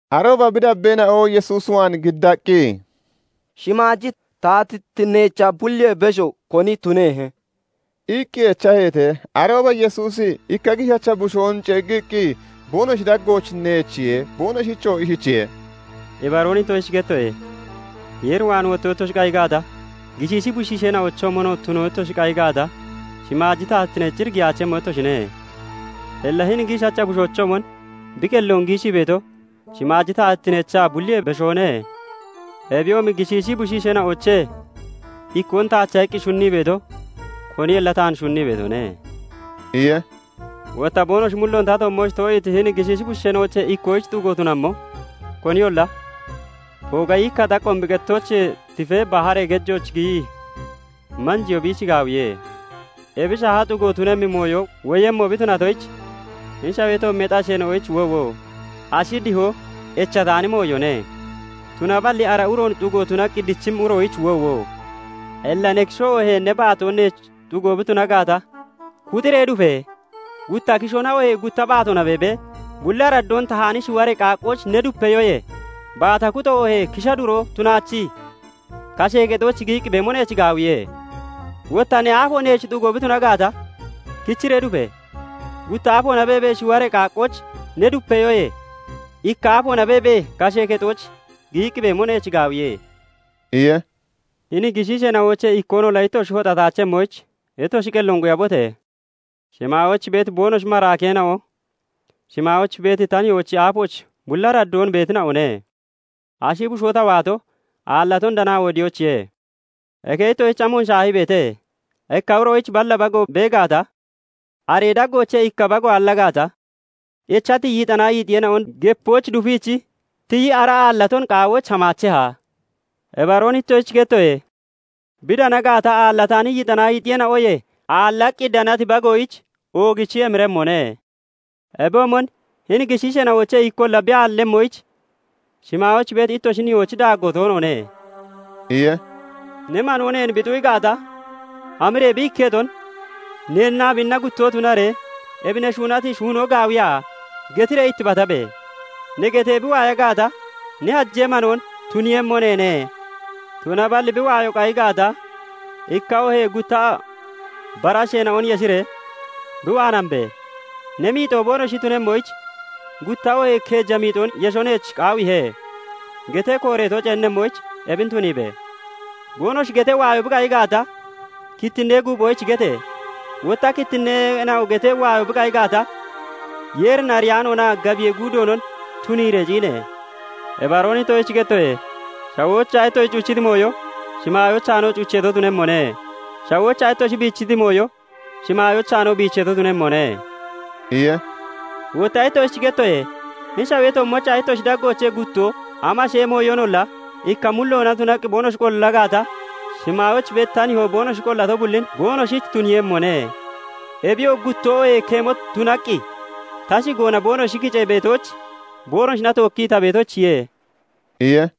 Arooba bi dabbeena'o Yesuus waan giddaqqi, "Shimaaji taatittineechaa bulliyee besho koni tunehe?" iqqi echaheete. Arooba Yesuusi ikka giishacha bushoon ceeggiqqi boonoshi daggooch neechiye; Boonoshichoo ishichiye:- "Ibaroon ittoshich gettoye; Yeer waan wotto ittoshi qayi gaata, gishiishi bushiishoochoomonoo tuno ittoshi qayi gaata, shimaaji taatittineech cir giyaachemmo ittoshine. Illa hini giishacha bushoochoomon bi qelloon giishii beeto shimaaji taatittineechaa bulliyee beshoone. Ebiyoomi gishiishi bushiisheena'oochee ikkoon taacha iqqi shunnii beeto koniyolla taan shunnii beetone" iye. "Wotta boonoshi mulloon ta toommooch too'iiti hini gishiisheena'oochee ikkoyich xugo tunammo koniyolla, ooga yiikka xaqqoon bi qettooch tifee baharee gejooch giyii manjeyoo biich gaawiye. Ebi shaaha xugo tunemmi mooyo woyemmo bi tunatoyich hini shawee toommeexi asheena'oyich woowo! Ashi dihoo echataani mooyone; tunaballi ara uroon xugo tunaqqi dichimmi uroyich woowo! Illa ne kishoo oohee ne baatoo neech xugo bi tuna gaata, kuxiree dufe! Gutta kishoona oohee gutta baatoona beebee, bulli araddoon tahaani shiwaree qaaqqooch ne dupeyoyee, baata kuxo oohee kisha duro tunaachii kashee kexooch giyiqqi beemo neech gaawiye. Wotta ne aafo neech xugo bi tuna gaata, kichiree dufe! Gutta aafoona beebee shiwaree qaaqqooch ne dupiyoyee ikka aafoona beebee kashee kexooch giyiqqi beemo neech gaawiye" iye. "Hini gishiisheena'oochee ikkoonolla ittoshi hoxataachemmoyich, ittoshi qelloon quyabote! Shimaayooch beeti boonoshi maraakeena'o shimaayooch beeti ta nihoochi aafooch bulli araddoon beetina'one. ["Ashi bushoo ta waato, aallaton danaa wodiyoyichiye.] "Eke ittoshich amon shaahii beete? Ikka uroyich balla bago bee gaata, aree daggoochee ikka bago aalla gaata, echati yixanaa yiixiyeena'on gepooch dufiichi tiyii ara aallaton qaawoyich hamaacheha? Ibaroon ittoshich gettoye; bi dana gaata, aallataani yixanaa yiixiyeena'oyee aallaqqi danati bagoyich oogichi emiremmone. Ebiyoomon hini gishiisheena'oochee ikkolla bi aallemmoyich shimaayooch beeti ittoshi nihoochi daaggoo toonoone" iye. "Ne manoo neen bi xu'i gaata, hamiree bi ikketon neennaa biinna guttoo tunaree, 'Ebi ne shuunati shuunoo gaawiya?' getiree ittibatabe! Ne getee bi waaya gaata, ne hajee manoon tuniiyemmo neene; Tunaballi bi waayoo qayi gaata, ikka oohee gutta bara asheena'on yeshiree bi waan hambe! 'Ne miixoo boonoshi tunemmoyich gutta oohee keeja miixoon yesho neech qaawiihe' getee kooreeto ceennemmoyich ebin tuniibe! Boonoshi getee waayo bi qayi gaata, kittinee guuphoyich gete! Wotta kittineena'o getee waayo bi qayi gaata, Yeerin ariyaanoonaa gabiyee guudoonon tuniiree ciine! "Ibaroon ittoshich gettoye; shawoochaa ittoshi cuchiti mooyo shimaayoochaanoo cucheeto tunemmone; shawoochaa ittoshi biichiti mooyo shimaayoochaanoo biicheeto tunemmone" iye. "Wotta ittoshich gettoye; hini shawee toommoochaa ittoshi daggoochee guttoo, amashee mooyoonolla ikka mulloona tunaqqi boonoshi qolla gaata, shimaayooch beeti ta nihoo boonoshi qollato bullin boonoshich tuniiyemmone. Ebiyoo guttoo oohee keemo tunaqqi ta shigoona boonoshi kicee beetooch boonoshina tookkii ta beetoyichiye" iye.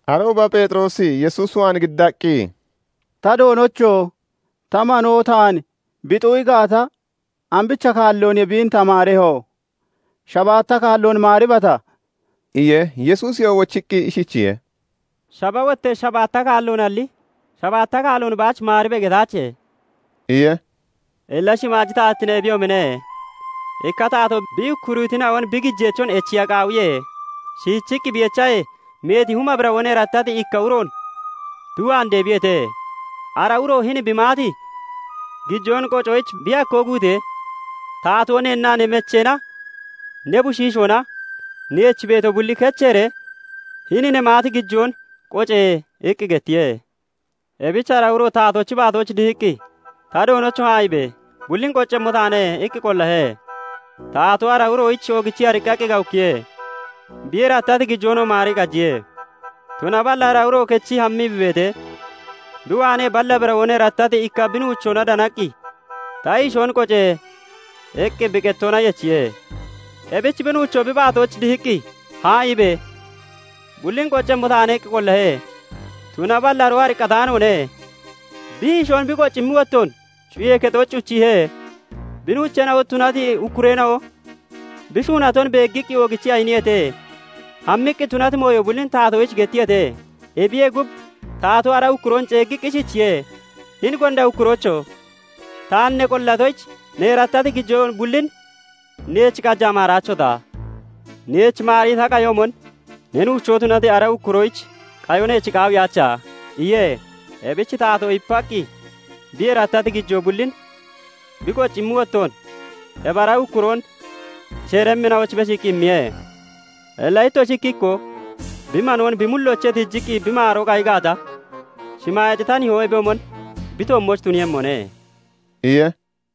Arooba Pheexiroosi Yesuus waan giddaqqi, "Ta Doonocho! Ta manoo taan bi xu'i gaata, ambicha kaallooniye biin ta maareho? Shabaatta kaalloon maaribata?" iye. Yesuusiyoo wochiqqi ishichiye:- "Shaba wottee shabaatta kaalloonalli, 'Shabaatta kaalloon baach maaribe!' getaache" iye. "Illa shimaaji taatittine ebiyoomine; ikka taatoo bi ukkuriitina'on bi gijeechon echiya qaawiye. Shiichiqqi bi echahee, meeti huma birawoon erattati ikka uroon bi waan deebiyeete. Ara uro hini bi maati gijoon qocoyich bi hakkoo guutee, taatoo 'Neennaa ne mecheena, ne bushiishoona, neech beeto bulli kecheeree hini ne maati gijoon qoce!' iqqi gettiye. "Ebich ara uro taatoochi baatooch dihiqqi, 'Ta Doonocho! Haa'iibe! Bullin qoccemmo taane' iqqi qollahe. Taatoo ara uroyich oogichii ariqqaqqi gawukkiye; bi erattati gijoonoo maarii qajiye. "Tunaballi ara uro kechii hammii bi beetee, bi waanee balla birawoon erattati ikka bi nuuchoona danaqqi, 'Ta hiishoon qoce!' iqqi bi qettoona yechiye. "Ebich bi nuucho bi baatooch dihiqqi, 'Haa'iibe! Bullin qoccemmo taane' iqqi qollahe. "Tunaballi aroo ariqqataanoone; bi hiishoon bi qoccimmi wottoon cuyee kexooch cuchiihe. Bi nuucheena'o tunati ukkureena'o bi shuunaton beeggiqqi oogichii ayiniyeete; hammiqqi tunati mooyo bullin taatoyich gettiyeete. "Ebiyee gub, taatoo ara ukkuroon ceeggiiqqi ishichiye:- 'Hini gonda ukkuroocho! Taan ne qollatoyich, ne erattati gijoo bullin neech qajaa maaraachota? Neech maarii ta qayoomon, ne nuuchoo tunati ara ukkuroyich qayo neech qaawiyaacha?' iye. Ebich taatoo ipaqqi bi erattati gijoo bullin bi qoccimmi wottoon ebi ara ukkuroon sheeremmina'oyich beshiiqqi immiye. "Illa ittoshi ikki ikkoo bi manoon bi mulloochee tiijiqqi bi maaroo qayi gaata, shimaayeexi ta nihoo ebiyoomon bi toommooch tuniiyemmone" iye.